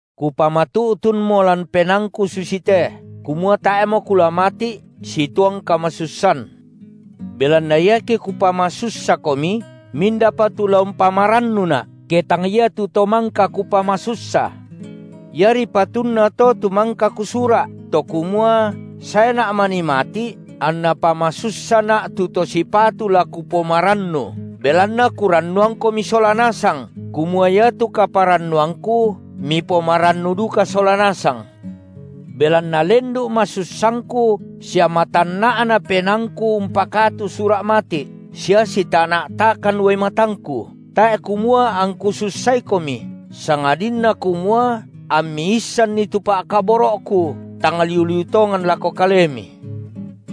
Kupamatu’tunmo lan penaangku susite, kumua tae’mo kula mati’ situang kamasussan. Belanna iake kupamasussakomi, mindapa tu la umpamarannuna’, ke tang iatu to mangka kupamasussa? Iari patunna to tu mangka kusura’, to kumua saena’ manii mati’ anna pamasussana’ tu to sipatu la kupomarannu, belanna kurannuangkomi sola nasang, kumua iatu kaparannuangku mipomarannu duka sola nasang. Belanna lendu’ masussangku sia matanna’na penaangku umpakatu sura’ mati’, sia sitana’takan uai matangku, tae’ kumua angku sussaikomi, sangadinna kumua ammi issanni tu pa’kaboro’ku tang liu-liu tongan lako kalemi.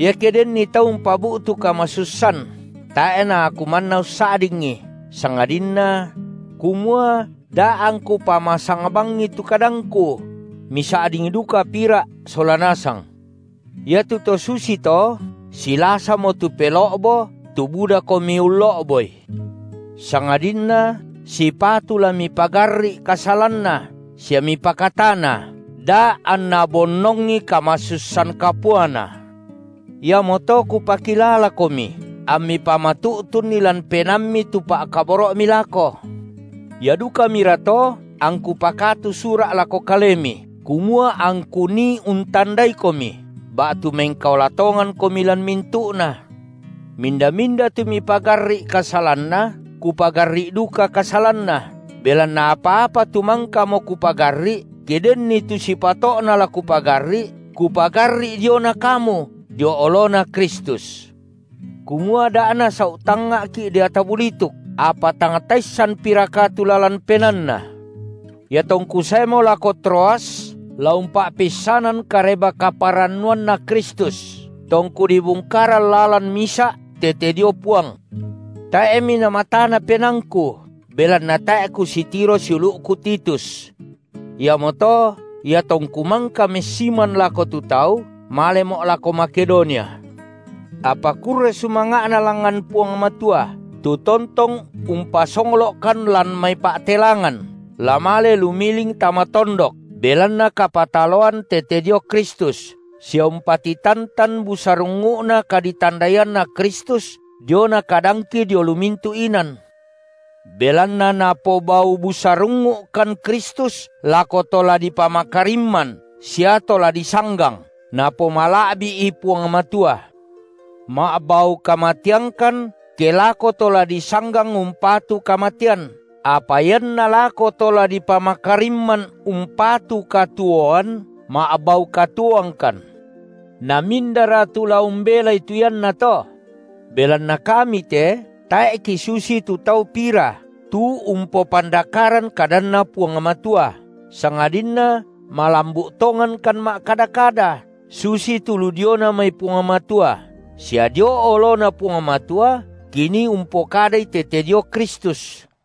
Iake denni tau umpabu’tu kamasussan, tae’ naaku manna ussa’dingi, sangadinna, – kumua da angku pamasang bangi tu kadangku –, misa’ding duka pira’ sola nasang. Iatu to susito silasamo tu pelo’bo tu budakomi ullo’boi. Sangadinna sipatu la mipagarri’ kasalanna sia mipakatana, da anna bonnongi kamasussan kapuana. Iamoto kupakilalakomi ammi pamatu’tunni lan penaammi tu pa’kaboro’mi lako. Ia dukamirato, angku pakatu sura’ lako kalemi, kumua angku nii untandaikomi, ba’tu mengkaola tongankomi lan mintu’na. Minda-minda tu mipagarri’ kasalanna, kupagarri’ duka kasalanna, belanna apa-apa tu mangkamo kupagarri’, ke denni tu sipato’na la kupagarri’, kupagarri’ diona kamu dio oloNa Kristus, kumua da’ nasau’ tangnga’ki’ deata bulituk, apa tang taissanpiraka tu lalan penaanna. Iatongku saemo lako Troas la umpa’peissanan Kareba-kaparannuanNa Kristus, tongku dibungkaran lalan misa’ tete dio Puang, tae’mi namatana penaangku, belanna tae’ kusitiro siulu’ku Titus. Iamoto, iatongku mangka messiman lako tu tau, malemo’ lako Makedonia. Apa kurre sumanga’na langngan Puang Matua, tu tontong umpasonglo’kan lan mai pa’telangan la male lumiling tama tondok belanna kapataloan tete dio Kristus sia umpatitantan busarungngu’na kaditandaianna Kristus diona kadangki dio lu mintu’ inan. Belanna napobau busarungngu’kan Kristus lako to la dipamakarimman sia to la disanggang napomala’bi’i Puang Matua; ma’bau kamateangkan ke lako to la disanggang umpatu kamatean, apa ianna lako to la dipamakarimman umpatu katuoan ma’bau katuoangkan. Namindara tu la umbelai tu iannato? Belanna kami te tae’ kisusitu tau pira tu umpopandakaran kadanNa Puang Matua, sangadinna malambu’ tongankan ma’kada-kada, susitu lu diona mai Puang Matua, sia dio oloNa Puang Matua kinii umpokadai tete dio Kristus.